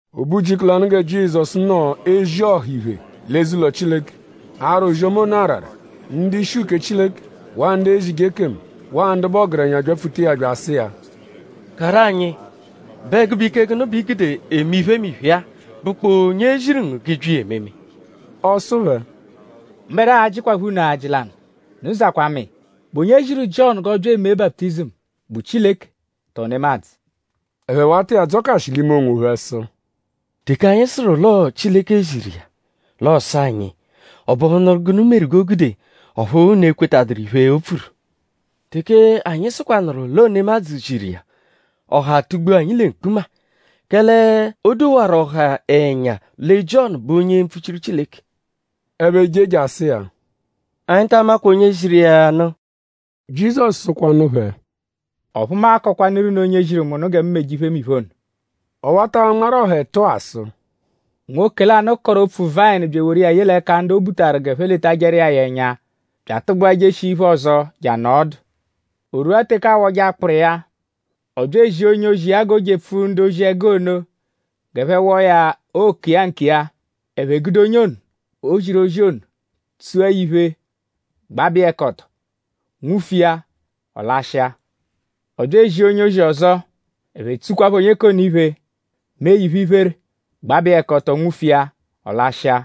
O be ujiku lanụ gẹ Jizọsu nọ ezi ọha iphe l'eze-ụlo Chileke; ara ozi-ọma ono arara; ndu-ishi uke Chileke; waa ndu ezije ekemu; waa ndu bụ ọgerenya byapfuta iya bya asụ iya: “Karụ anyi?Bụ ẹgube ike gụnu bẹ i gude eme iphemiphe-a??Bụkpoo onye ziru ngu g'ị bya iya ememe?” Ọ sụ phẹ: “Mbẹdua a-jịkwapho unu ajị lanụ. Unu zakwaa mu iya. ?Bụ onye ziru Jiọnu g'ọ bya eme baputizimu??Bụ Chileke; tọo nemadzụ?” Ẹphe wata iya adzọkashi l'ime onwophẹ sụ: “Teke anyi sụru l'ọo Chileke ziru iya; l'ọo-sụ anyi: ‘?Ọ bụhunuru gụnu meru g'o gude ọphu unu ekwetaduru iphe, o pfuru?’ Teke anyi sụkwanuru l'ọo nemadzụ ziru iya; ọha atugbua anyi lẹ mkpuma; kẹle o dowarụ ọha ẹnya lẹ Jiọnu bụ onye mpfuchiru Chileke.” Ẹphe je jasụ iya: “Anyi ta amakwa onye ziru iya ya nụ.” “Jizọsu sụkwanu phẹ: Ọphu mu a-kọkwanuru unu onye ziru mu nụ gẹ mu meje iphemiphe ono.” Ọ wata anmarụ ọha ẹtu-a sụ: “Nwoke lanụ kọru opfu-vayịnu bya eworu iya ye l'ẹka ndu o butaru g'ẹphe letajẹru iya ya ẹnya; bya atụgbua jeshia iphe-ọzo je anọo ọdu. O rwua teke aawọje akpụru iya; ọ bya ezia onye-ozi iya g'o jepfu ndu-ozi-ẹgu ono g'ẹphe wọo ya oke iya nkiya. Ẹphe gude onye ono, o ziru ozi ono; tsua ya iphe; gbabẹ iya ẹka ọto; nwufu iya; ọ lashịa. Ọ bya ezia onye-ozi ọzo; ẹphe tsukwaphọ onye k'ono iphe; mee ya iphe-iphere; gbabẹ iya ẹka ọto; nwufu iya; ọ lashịa.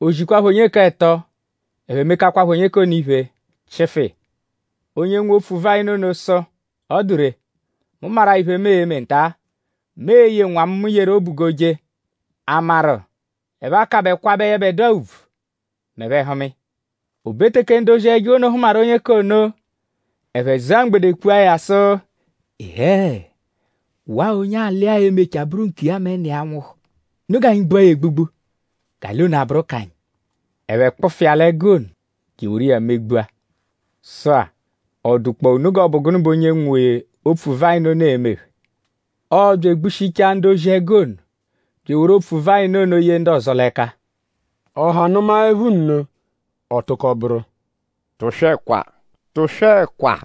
O zikwaaphọ onye k'ẹto; ẹphe mekakwaphọ onye k'ono iphe; chịfu iya. Onye ono, nwe opfu-vayịnu ono sụ: ‘Ọ dụ ree; mu maru-a iphe, mu e-me nta. Mu e-ye nwa mu, mu yeru obu g'o je.?A maru;?ẹphe a-kabẹ kwabẹ yẹbedua ùbvù m'ẹphe -hụma iya?’ O be teke ndu-ozi-ẹgu ono hụmaru onye k'ono; ẹphe zụa mgbede kpua ya sụ: ‘Ịhee! Waa onye alị-a e-mechaa bụru nkiya mẹ nna iya -nwụhu. Unu g'anyi gbua ya egbugbu; g'alị ono a-bụru k'anyi.’ Ẹphe kpụfu iya l'ẹgu ono je eworu iya megbua. “Sụ-a;?Ọ dụkpoo unu g'ọ bụ gụnu bẹ onye nwe opfu-vayịnu ono e-me phẹ? Ọo-bya egbushichaa ndu-ozi-ẹgu ono bya eworu opfu-vayịnu ono ye ndu ọzo l'ẹka.” Ọha nụmaepho nno; ọ tụko bụru: “Tụswekwa! Tụswekwa!”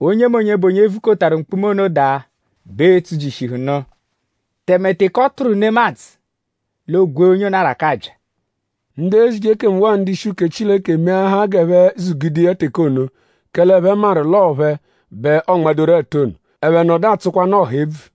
Onyemonye, bụ onye vukotaru mkpuma ono daa; bẹ e-tsujishihunu; tẹme teke ọ tụru nemadzụ; l'ogwee onye ono arakabya.” Ndu ezije ekemu waa ndu-ishi ndu-uke Chileke meahaa g'ẹphe zugude iya teke ono; kẹle ẹphe maru l'ọo phẹ bẹ ọonmadoru ẹtu ono; ẹphe nọdu atsụkwanu ọha ebvu.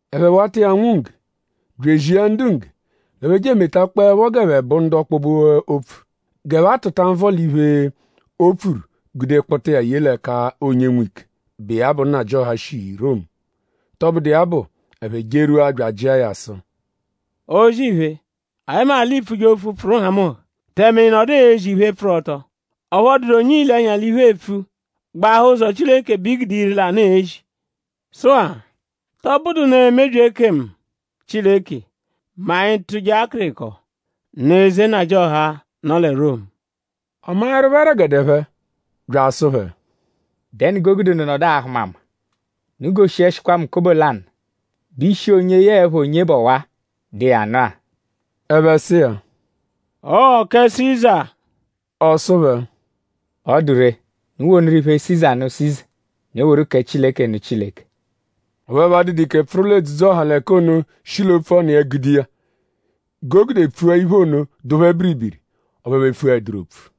Ẹphe wata iya anwụ ngge; bya ezia ndu ngge g'ẹphe je emetakpọepho g'ẹphe bụ ndu ọkpobe-opfu; g'ẹphe a-tụta nvọ l'iphe, o pfuru gude kpụta iya ye l'ẹka onye nwe ike, bụ iya bụ nnajịoha, shi Romu. Tọbudu iya bụ; ẹphe jerwua bya ajịa ya sụ: “O-zì-iphe; anyi maru l'iipfuje opfu, pfụru nhamụnha; tẹme ị nọdu ezi iphe, pfụru ọto; ọphu ọ dụdu onye iile ẹnya l'iphu epfu; gbahaa ụzo Chileke bẹ i gude ire-lanụ ezi. Sụ-a;?tọ bụdunu emebyi ekemu Chileke mẹ anyi -tụje akịriko nụ eze nnajịoha, nọ lẹ Romu?” Ọ maẹrupho ẹregede phẹ bya asụ phẹ:?Dẹnu g'o gude unu nọdu ahụ mu ama? “Unu goshiẹshikwa mu kobo lanụ.?Bụ ishi onye yẹe ẹpha onye bụ ọwa-a, dụ iya nụ-a?” Ẹphe sụ iya: “Ọo kẹ Siza!” Ọ sụ phẹ: “Ọ dụ ree; unu wonụru iphe Siza nụ Siza; unu eworu kẹ Chileke nụ Chileke.” Ọphu ẹphe adụdu ike pfụru l'edzudzu-ọha l'ẹka ono shi l'opfu ọnu iya gude iya. G'o gude pfua iphe ono dụ phẹ biribiri. Ọphu ẹphe epfuẹduru opfu.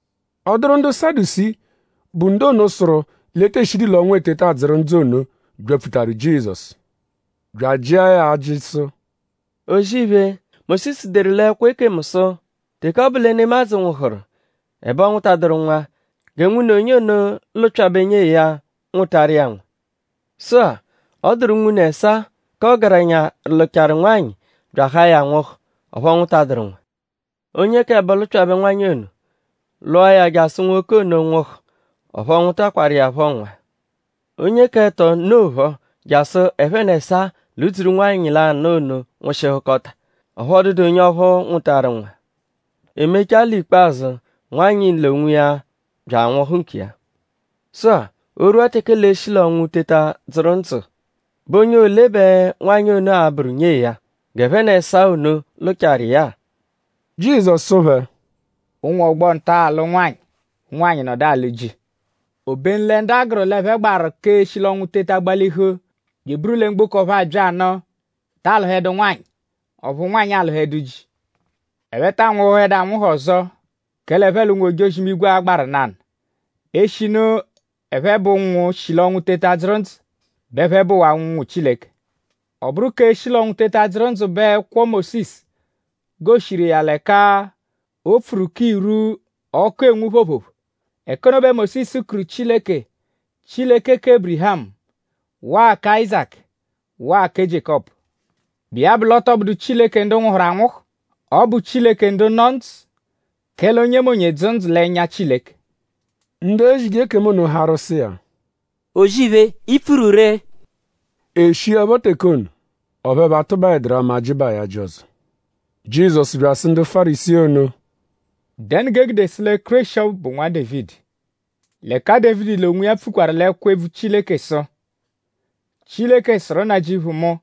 Ọ dụru ndu Sadusii, bụ ndu ono, sụru l'e tee shidu l'ọnwu eteta adzụru ndzụ ono; byapfutaru Jizọsu. Bya ajịa ya ajị sụ: “O-zì-iphe; Mósisu deru l'ẹkwo ekemu sụ: Teke ọ bụ lẹ nemadzụ nwụhuru; ẹbe ọ nwụtaduru nwa; gẹ nwune onye ono lụpyabe nyee ya; nwụtaru iya nwa. Sụ-a; ọ dụru unwune ẹsaa, k'ọgerenya lụchaaru nwanyị bya ahaa ya nwụhu; ọphu ọ nwụtaduru nwa. Onye k'ẹbo lụpyabe nwanyị ono. Lụa ya jasụ nwoke ono nwụhu; ọphu ọ nwụtakwaru iya phọ nwa. Onye k'ẹto nnophọ; jasụ ẹphe n'ẹsaa ludzuru nwanyị lanụ ono nwụshihukota; ọphu ọ dụdu onye ọphu nwụtaru nwa. E mechaa l'ikpazụ; nwanyị l'onwiya bya anwụhu nkiya. Sụ-a; o -rwua teke l'ee-shi l'ọnwu teta dzụru ndzụ;?bụ onye ole bẹ nwanyị ono a-bụru nyee ya? G'ẹphe n'ẹsaa ono lụchaaru iya-a.” Jizọsu sụ phẹ: “Ụnwu ọgbo-nta-a alụ nwanyị; ụnwanyi nọdu alụ ji; obenu lẹ ndu a gụru l'ẹphe gbaru k'eshi l'ọnwu teta gbalihu bya eburu lẹ mgboko ọphu a-bya nụ taa lụhedu nwanyị; ọphu nwanyị alụhedu ji. Ẹphe taa nwụhuhedu anwụhu ọzo; kẹle ẹphe l'ụnwu-ojozi-imigwe a-gbaru nanụ. Eshinu ẹphe bụ ụnwu, shi l'ọnwu teta dzụru ndzụ bẹ ẹphe bụwaa ụnwu Chileke. Ọ -bụru k'eshi l'ọnwu teta dzụru ndzụ bẹ ẹkwo Mósisu goshiru iya l'ẹka o pfuru k'irwu, ọku enwu phoophoophoo. Ẹka ono bẹ Mósisu kuru Chileke: Chileke kẹ Ébirihamu; waa kẹ Áyizaku; waa kẹ Jiékọpu. Bụ iya bụ l'ọ tọ bụdu Chileke ndu nwụhuru anwụhu. Ọ bụ Chileke ndu nọ ndzụ; kẹle onyemonye dzụ ndzụ l'ẹnya Chileke.” Ndu ezije ekemu ono harụ sụ iya: “O-zì-iphe! I pfuru ree!” E shiẹpho teke ono, ọphu ẹphe atụbaeduru ama ajịbaa ya ajị ọzo. Jizọsu bya asụ ndu Fárisii ono: “?Dẹnu g'e gude sụ lẹ Kéreshi ọbu bụ Nwa Dévidi; l'ẹka Dévidi l'onwiya pfukwaru l'ẹkwo-ebvu Chileke sụ: “Chileke sụru Nnajịuphu mu: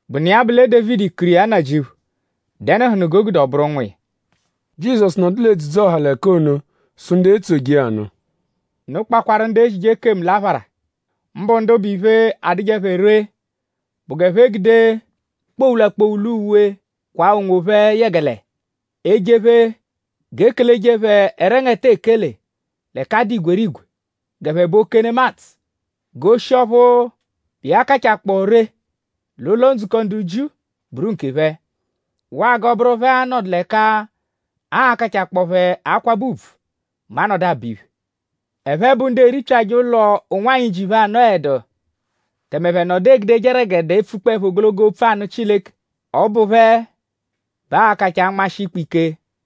Bụnu iya bụ lẹ Dévidi kuru iya Nnajịuphu!?Dẹnuhunu g'o gude ọ bụru nwa iya? Jizọsu nọdu l'edzudzu-ọha l'ẹka ono sụ ndu etsoje iya nụ: “Unu kpakwaru ndu ezije ekemu l'aphara; mbụ ndu bụ iphe, adụje phẹ ree bụ g'ẹphe gude kpowula-kpowula uwe kwaa onwophẹ yẹgele ejephe; g'e keleje phẹ ẹrengete ekele l'ẹka a dụ igwerigwe g'ẹphe bụ oke nemadzụ. G'oshi ọphu bụ iya kachakpọo ree l'ụlo-ndzukọ ndu Jiu bụru nkephẹ; waa g'ọ bụru phẹ a-nọdu l'ẹka aa-kachakpọo phẹ akwabẹ ùbvù mẹ a -nọdu abọ iphe. Ẹphe bụ ndu eripyajẹ ụlo ụnwanyi, ji phẹ anọedu; tẹme ẹphe nọdu egudeje ẹregede epfukpọepho ogologo opfu anụ Chileke. Ọ bụ phẹ bẹ aa-kachaa anmashị ikpe ike.”